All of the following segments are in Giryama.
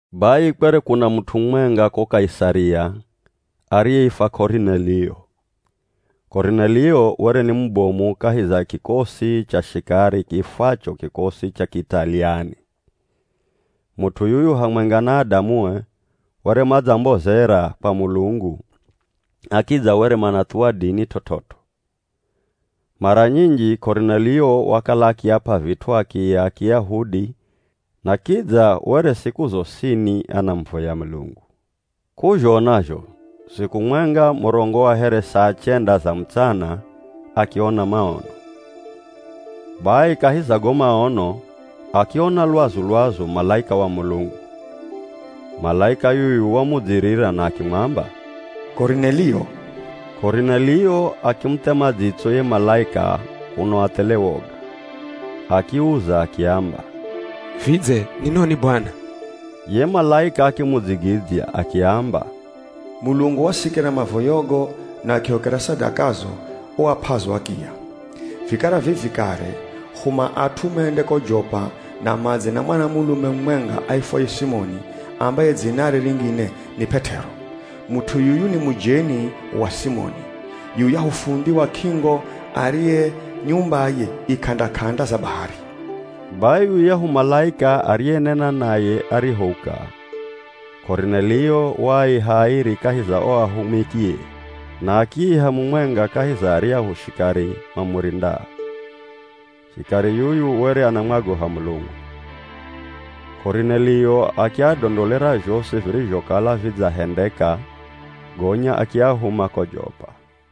Bai kwere kuna mut'u mumwenga ko Kaisaria ariyeifwa Korinelio. Korinelio were ni mubomu kahi za kikosi cha shikari kiifwacho “Kikosi cha Kiitaliani.” Mut'u yuyu hamwenga na adamue were madzambozera kwa Mulungu na kidza were manathuwa dini t'ot'ot'o. Mara nyinji, Korinelio wakala akiap'a vit'u akiya a Kiyahudi na kidza were siku zosini anamuvoya Mulungu. K'uzhona zho siku mwenga murongo wa here saa chenda za mutsana akiona maono. Bai kahi za go maono akiona lwazu-lwazu malaika wa Mulungu. Malaika yuyu wamudzirira na akimwamba, “Korinelio!” Korinelio akimuthema dzitso ye malaika kuno athele woga. Akiuza akiamba, “Vidze ni noni Bwana?” Ye malaika akimudzigidzya akiamba, “Mulungu wasikira mavoyogo na akihokera sadakazo uap'azo akiya. Vikara vivi kare huma at'u mende ko Jopa na madze na mwanamulume mumwenga aifwaye Simoni ambaye dzinare ringine ni P'et'ero. Mut'u yuyu ni mujeni wa Simoni, yuyahu fundhi wa k'ingo ariye nyumbaye i k'anda-k'anda za bahari.” Bai yuyahu malaika ariyenena naye arihouka, Korinelio waaiha airi kahi za o ahumikie na akiiha mumwenga kahi za aryahu shikari mamurindao. Shikari yuyu were anamwagoha Mulungu. Korinelio akiadondolera zhosi virizhokala vidzahendeka gonya akiahuma ko Jopa.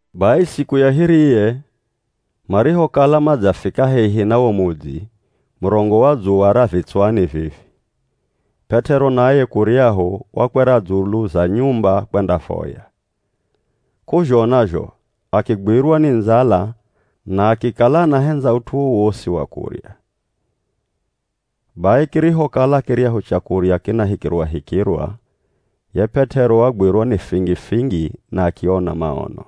Bai siku ya hiriye marihokala madzafika hehi na wo mudzi murongo wa dzuwa ra vitswani vivi, P'et'ero naye kuryahu, wakwera dzulu za nyumba kwendavoya. K'uzhona zho akigwirwa ni ndzala na akikala anahendza ut'u wowosi wa kurya. Bai kirihokala kiryahu chakurya kinahikirwahikirwa ye P'et'ero wagwirwa ni fingifingi na akiona maono.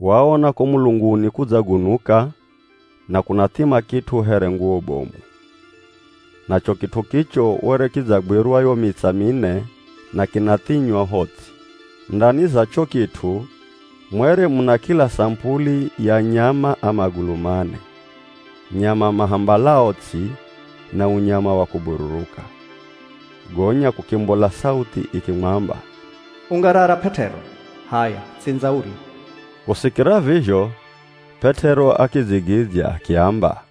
Waona ko mulunguni kudzagunuka na kunathima kit'u here nguwo bomu. Nacho kit'u kicho were kidzagwirwa yo mitsa mine na kinathinywa ho ts'i. Ndani za cho kit'u mwere muna kila samupuli ya nyama a magulu mane, nyama mahambalao ts'i na unyama wa kubururuka. Gonya kukimbola sauthi ikimwamba, “Ungarara P'et'ero. H'aya, tsindza urye!” Kusikira vizho P'et'ero akidzigidzya akiamba,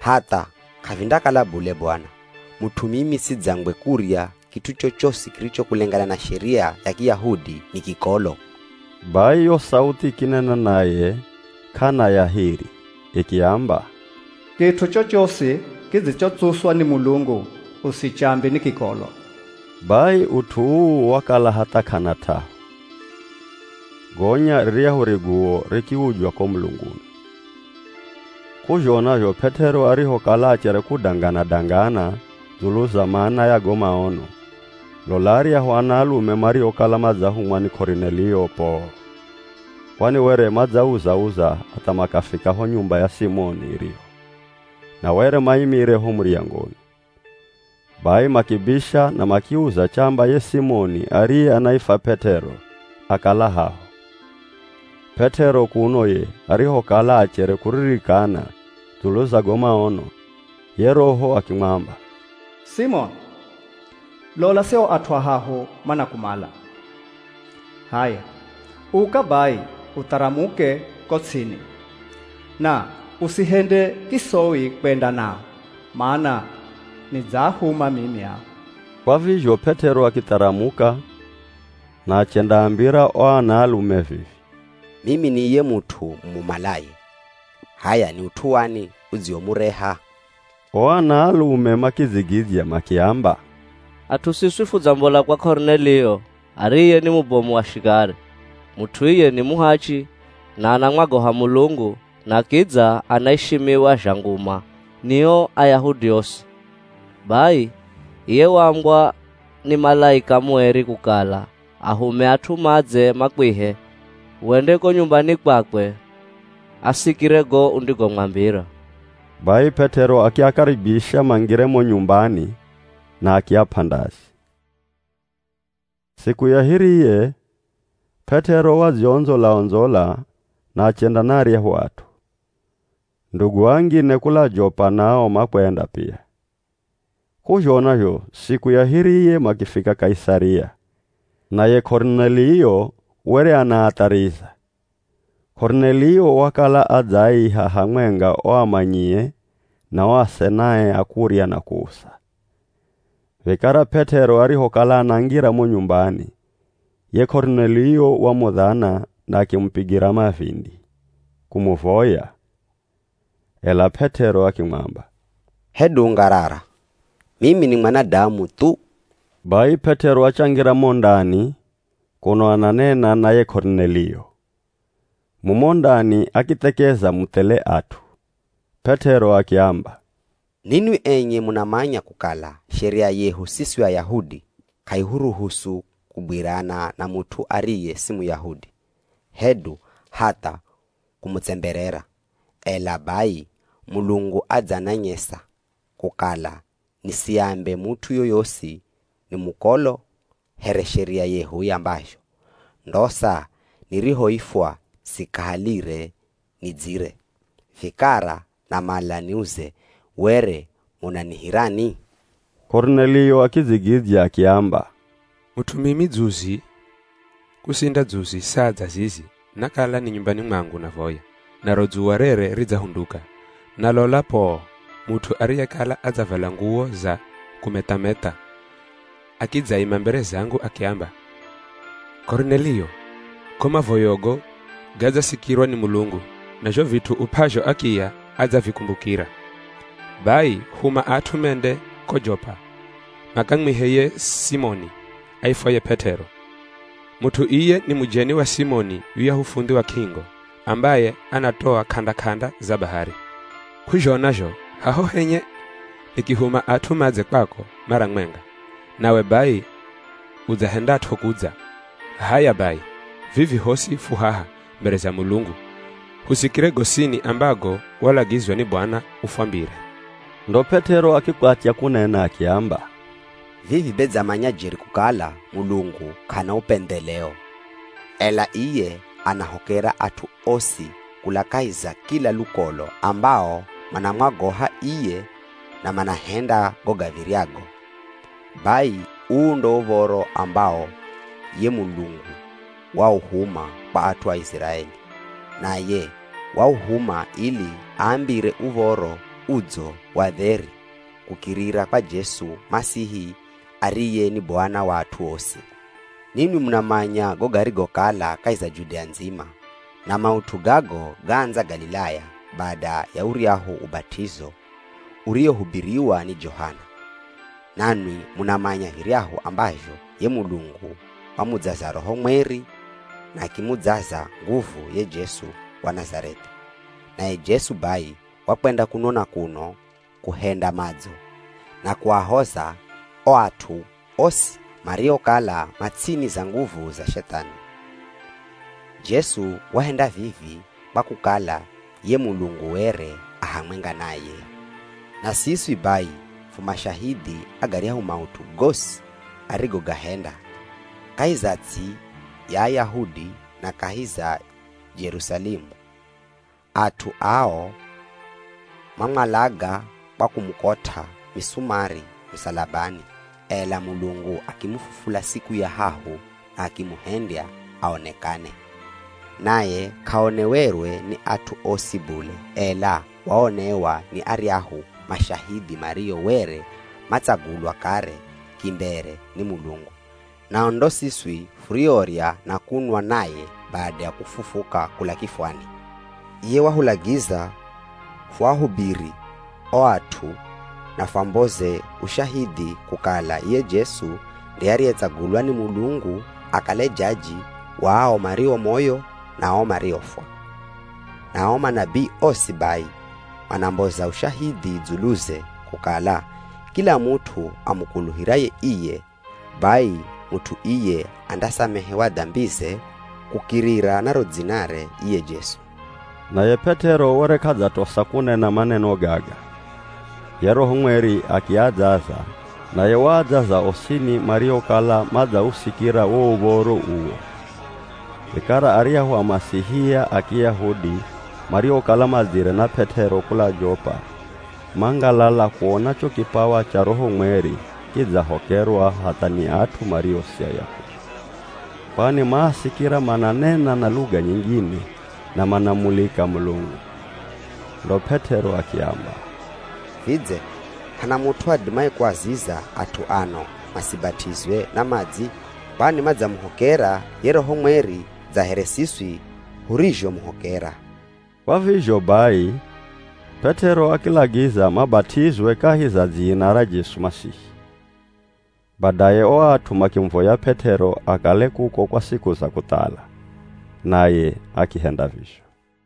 “Hatha, k'avindakala bule Bwana, mut'u mimi sidzangwe kurya kit'u chochosi kiricho kulengana na sheria ya Kiyahudi ni kikolo.” Bai yo sauthi ikinena naye k'ana ya hiri ikiamba, “Kit'u chochosi kidzichotsuswa ni Mulungu, usichambe ni kikolo.” Bai ut'u uu wakala hatha k'ana t'ahu, gonya riryahu riguwo rikiujwa ko mulunguni. K'uzhona zho P'et'ero arihokala achere kudangana-dangana dzulu za mana ya go maono, lola aryahu anaalume mariokala madzahumwa ni Korinelio poo! Kwani were madzauza-uza hatha makafika ho nyumba ya Simoni iriho, na were maimire ho muryangoni. Bai makibisha na makiuza chamba ye Simoni ariye anaifwa P'et'ero akala haho. P'et'ero kuno ye, arihokala achere kuririkana dzulu za go maono, ye Roho akimwamba, “Simoni, lola sio at'u ahahu manakumala. H'aya, uka bai utharamuke ko ts'ini, na usihende kisoi kwenda nao, mana nidzaahuma mimi ao.” Kwa vizho P'et'ero akitharamuka na achendaambira o anaalume vivi, “Mimi ni iye mut'u mumumalaye. H'aya, ni ut'u wani udziwomureha?” O anaalume makidzigidzya makiamba, “At'u siswi fudzambola kwa Korinelio, ariye ni mubomu wa shikari. Mut'u iye ni muhachi na anamwagoha Mulungu na kidza anaishimiwa zha nguma ni o Ayahudi osi. Bai iye waambwa ni malaika mueri kukala ahume at'u madze makwihe wende ko nyumbani kwakwe asikire go undigomwambira.” Bai P'et'ero akiakaribisha mangire mo nyumbani na akiap'a ndazi. Siku ya hiriye P'et'ero wadziondzola-ondzola na achenda na aryahu at'u. Ndugu angine kula Jopa nao makwenda pia. K'uzhona zho siku ya hiriye makifika Kaisaria. Naye Korinelio were anaathariza. Korinelio wakala adzaaiha hamwenga o amanyie, na o asenae a kurya na kuusa. Vikara P'et'ero arihokala anangira mo nyumbani, ye Korinelio wamudhana na akimupigira mavindi kumuvoya. Ela P'et'ero akimwamba, “Hedu ungarara! Mimi ni mwanadamu thu.” Bai P'et'ero achangira mo ndani kuno ananena na ye Korinelio. Mumo ndani akithekeza mu thele at'u. P'et'ero akiamba, “Ninwi enye munamanya kukala Sheria yehu siswi Ayahudi k'aihuruhusu kugwirana na mut'u ariye si Muyahudi, hedu hatha kumutsemberera. Ela bai Mulungu adzananyesa kukala nisiambe mut'u yoyosi ni mukolo here sheria yehu iambazho. Ndosa nirihoifwa sikahalire, nidzire. Vikara namala niuze, were munanihirani?” Korinelio akidzigidzya akiamba, “Mut'u mimi, dzuzi kusinda dzuzi saa dza zizi nakala ni nyumbani mwangu navoya, naro dzuwa rere ridzahunduka. Na lola poo, mut'u ariyekala adzavala nguwo za kumetha-metha akidzaima mbere zangu akiamba, ‘Korinelio! Go mavoyogo gadzasikirwa ni Mulungu na zho vit'u up'azho akiya adzavikumbukira. Bai huma at'u mende ko Jopa makamwihe ye Simoni, aifwaye P'et'ero. Mut'u iye ni mujeni wa Simoni yuyahu fundhi wa k'ingo ambaye anatoa k'anda-k'anda za bahari.’ K'uzhona zho haho henye, nikihuma at'u madze kwako mara mwenga, nawe bai udzahendat'o kudza. H'aya bai, vivi hosi fu haha mbere za Mulungu husikire gosini ambago walagizwa ni Bwana ufwambire.” Ndo P'et'ero akikwatya kunena akiamba, “Vivi be dzamanya jeri kukala Mulungu k'ana upendheleo. Ela iye anahokera at'u osi kula kahi za kila lukolo ambao manamwagoha iye na manahenda go gav̱iryago. Bai uu ndo uv̱oro ambawo ye Mulungu wauhuma kwa at'u a Iziraeli, naye wauhuma ili aambire Uv̱oro Udzo wa dheri kukirira kwa Jesu Masihi ariye ni Bwana wa at'u osi. Ninwi munamanya go garigokala kahi za Judea ndzima, na maut'u gago gaandza Galilaya bada ya uryahu ubat'izo uriwohubiriwa ni Johana. Nanwi munamanya viryahu ambazho ye Mulungu wamudzaza Roho Mweri na akimudzaza nguvu ye Jesu wa Nazareth'i. Naye Jesu bai wakwenda kuno na kuno kuhenda madzo, na kuahoza o at'u osi mariokala ma ts'ini za nguvu za Shethani. Jesu wahenda vivi kwa kukala ye Mulungu were a hamwenga naye. “Na siswi bai fu mashahidhi a garyahu maut'u gosi arigogahenda kahi za ts'i ya Ayahudi na kahi za Jerusalemu. At'u ao mamwalaga kwa kumukot'a misumari musalabani. Ela Mulungu akimufufula siku ya hahu na akimuhendya aonekane. Naye k'aonewerwe ni at'u osi bule, ela waonewa ni aryahu mashahidhi mario were matsagulwa kare kimbere ni Mulungu, nao ndo siswi furiorya na kunwa naye bada ya kufufuka kula kifwani. Iye wahulagiza fuahubiri o at'u na fwamboze ushahidhi kukala iye Jesu nde ariyetsagulwa ni Mulungu akale jaji wa ao mario moyo na ao mariofwa. Na ao manabii osi bai manamboza ushahidhi dzuluze, kukala kila mut'u amukuluhiraye iye, bai mut'u iye andasamehewa dambize kukirira na ro dzinare iye Jesu.” Naye P'et'ero were k'adzatosa kunena maneno gaga, ye Roho Mweri akiadzaza, naye waadzaza osini mariokala madzausikira wo uv̱oro uwo. Vikara aryahu Amasihia a Kiyahudi mariokala madzire na P'et'ero kula Jopa mangalala kuona cho kipawa cha Roho Mweri kidzahokerwa hatha ni at'u mario si Ayahudi. Kwani maasikira mananena na luga nyingine na manamulika Mulungu. Ndo P'et'ero akiamba, “Vidze hana mut'u adimaye kuaziza at'u ano masibat'izwe na madzi? Kwani madzamuhokera ye Roho Mweri dza here siswi hurizhomuhokera.” Kwa vizho bai, P'et'ero akilagiza mabat'izwe kahi za dzina ra Jesu Masihi. Badaye o at'u makimuvoya P'et'ero akale kuko kwa siku za kuthala, naye akihenda vizho.